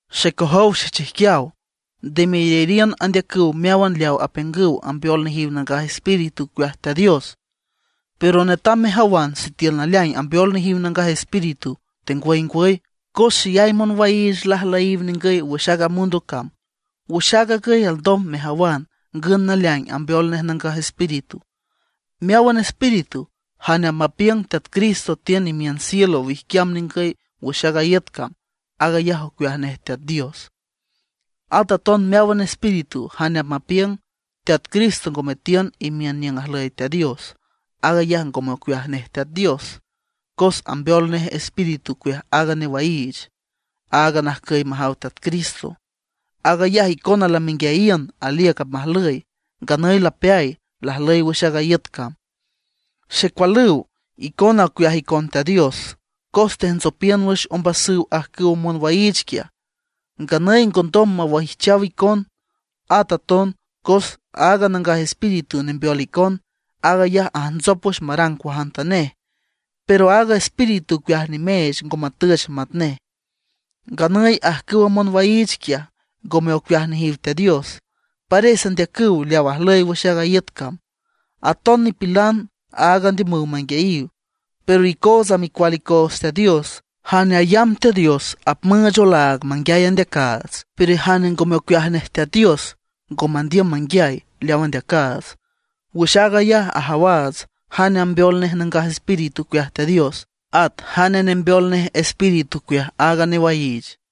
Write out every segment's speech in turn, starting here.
Xecojow xechijquiaw, nde meyariün andeacüw meáwan leaw apiüngüw ambeol nejiw Nangaj Espíritu ocueaj Teat Dios, pero netam mejawan sitiül naleaing ambeol nejiw Nangaj Espíritu, tengwüy ngwüy; cos xeyay monwaiich lajlüyiw ningüy wüx aaga mundo cam. Wüx aag agüy alndom mejawan ngün naleaing ambeol nej Nangaj Espíritu: Meáwan espíritu jane apmapiüng Teat Jesucristo tiün imiün cielo wijquiam ningüy wüx aaga iüt cam, aag ayaj ocueaj nej Teat Dios. At aton meáwan espíritu jane apmapiüng Teat Cristo ngome tiün imiün niüng ajlüy Teat Dios, aag ayaj ngome ocueaj nej Teat Dios; cos ambeol nej espíritu ocueaj aaga newaiich aaga najcüy majaw Teat Cristo. Aag ayaj icona lamenguiayiün aliüc apmajlüy, nganüy lapeay, lajlüy wüx aaga iüt cam. Xecualüw, icona ocueaj icon Teat Dios. Cos tejntsopiün wüx ombasüw ajcüwa monwaiich quiaj, nganüy ngondom mawaijchaw icon. At aton cos aaga Nangaj Espíritu nembeol icon, aag ayaj ajntsop wüx marang cuajantanej; pero aaga espíritu ocueaj nimeech ngo matüch matnej. Nganüy ajcüwa monwaiich quiaj, ngome ocueaj nejiw Teat Dios; pares andeacüw leaw ajlüy wüx aaga iüt cam, aton nipilan aag andiümüw manguiayiw. Pero icootsa micual icoots Teat Dios. Jane ayamb Teat Dios apmüüch olaag manguiay andeacaats; pero jane ngome ocueaj nej Teat Dios ngo mandiüm manguiay leaw andeacaats. Wüx aag ayaj ajawaats jane ambeol nej Nangaj Espíritu ocueaj Teat Dios, at jane nembeol nej espíritu ocueaj aaga newaiich.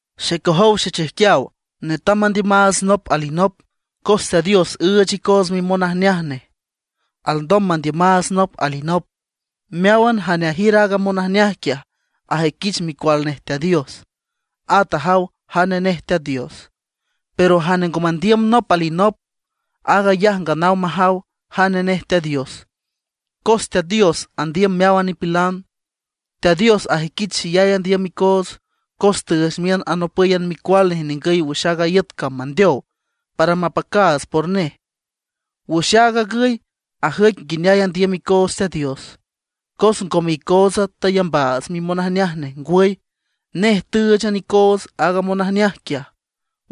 Xecojow xechijquiaw, netam mandiümaats nop alinop, cos Teat Dios üüch icoots mimonajneaj nej alndom mandiümaats nop alinop. Meáwan jane ajiür aaga monajneaj quiaj ajüiquich micual nej Teat Dios, at ajaw jane nej Teat Dios. Pero jane ngo mandiüm nop alinop, aag ayaj nganaw majaw jane nej Teat Dios, cos Teat Dios andiüm meáwan nipilan. Teat Dios ajüiquich xeyay andiüm icoots, cos tüüch miün anopǘyan Micual nej ningüy wüx aaga iüt cam mandeow para mapacaats por nej. Wüx aag agüy ajüic nguineay andiüm icoots Teat Dios: cos ngome icootsa tayambaats mimonajneaj nej; ngwüy, nej tǘüchan icoots aaga monajneaj quiaj,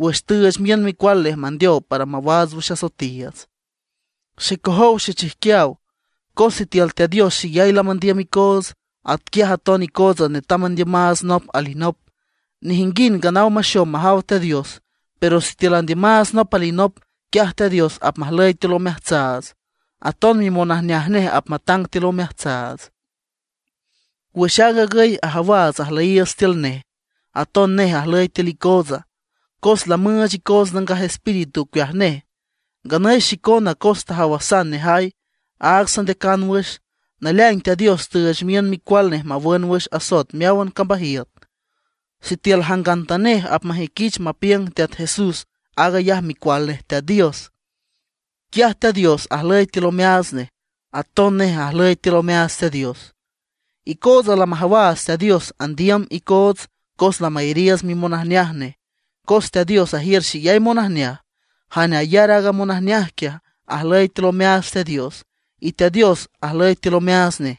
wüx tüüch miün Micual nej mandeow para mawaats wüx asoetiiüts. Xecojow xechijquiaw, cos sitiül Teat Dios xeyay lamandiüm icoots, atquiaj aton icootsa netam mandiümaats nop alinop. Nejinguind nganaw maxom majaw Teat Dios, pero sitiül andiümaats nop alinop, quiaj Teat Dios apmajlüy tiül omeajtsaats; aton mimonajneaj nej apmatang tiül omeajtsaats. Wüx aag agüy ajawaats ajlüyiiüts tiül nej, aton nej ajlüy tiül icootsa, cos lamüüch icoots Nangaj Espíritu ocueaj nej. Nganüy xicona cos tajawasan nejay, aag sandeacan wüx, naleaing Teat Dios tüüch miün Micual nej mawün wüx asoet meáwan cambajiüt. Sitiül jangantanej apmajüiquich mapiüng Teat Jesús aag ayaj Micual nej Teat Dios, quiaj Teat Dios ajlüy tiül omeaats nej, aton nej ajlüy tiül omeaats Teat Dios. Icootsa lamajawaats Teat Dios andiüm icoots cos lamayariiüts mimonajneaj nej. Cos Teat Dios ajiür xeyay monajneaj, jane ayar aaga monajneaj quiaj, ajlüy tiül omeaats Teat Dios, y Teat Dios ajlüy tiül omeaats nej.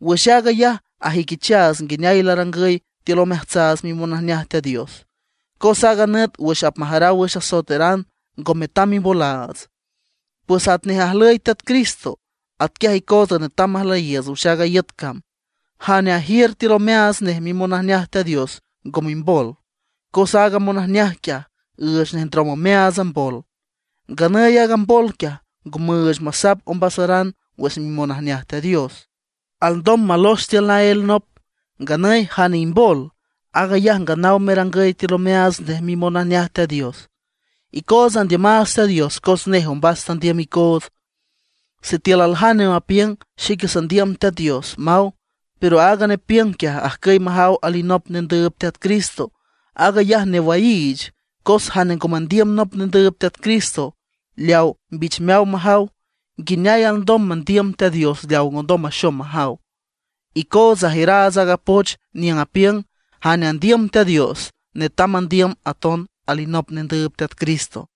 Wüx aag ayaj ajüiquichaats nguineay larangüy tiül omeajtsaats mimonajneaj Teat Dios, cos aaga nüt wüx apmajaraw wüx asoetaran ngo metam mimbolaats. Pues atnej ajlüy Teat Cristo, atquiaj icoots netam majlüyiiüts wüx aaga iüt cam. Jane ajiür tiül omeaats nej mimonajneaj Teat Dios ngo mimbol, cos aaga monajneaj quiaj üüch nej ndrom omeaats mbol. Nganüy aaga mbol quiaj ngo müüch masap ombasaran wüx mimonajneaj Teat Dios; alndom malox tiül naél nop. Nganüy jane imbol, aag ayaj nganaw merangüy tiül omeaats nej mimonajneaj Teat Dios. Icootsa andiümaats Teat Dios cos nej ombas tandiüm icoots. Sitiül aljane apiüng: “Xique sandiüm Teat Dios”, maw; pero aaga nepiüng quiaj ajcüy majaw alinop nendüüb Teat Cristo, aag ayaj newaiich. Cos jane ngo mandiüm nop nendüüb Teat Cristo leaw mbichmeaw majaw ¿nguineay alndom mandiüm Teat Dios leaw ngondom maxom majaw? Icootsa ajiüraats aaga poch niüng apiüng: jane andiüm Teat Dios, netam mandiüm aton alinop nendüüb Teat Cristo.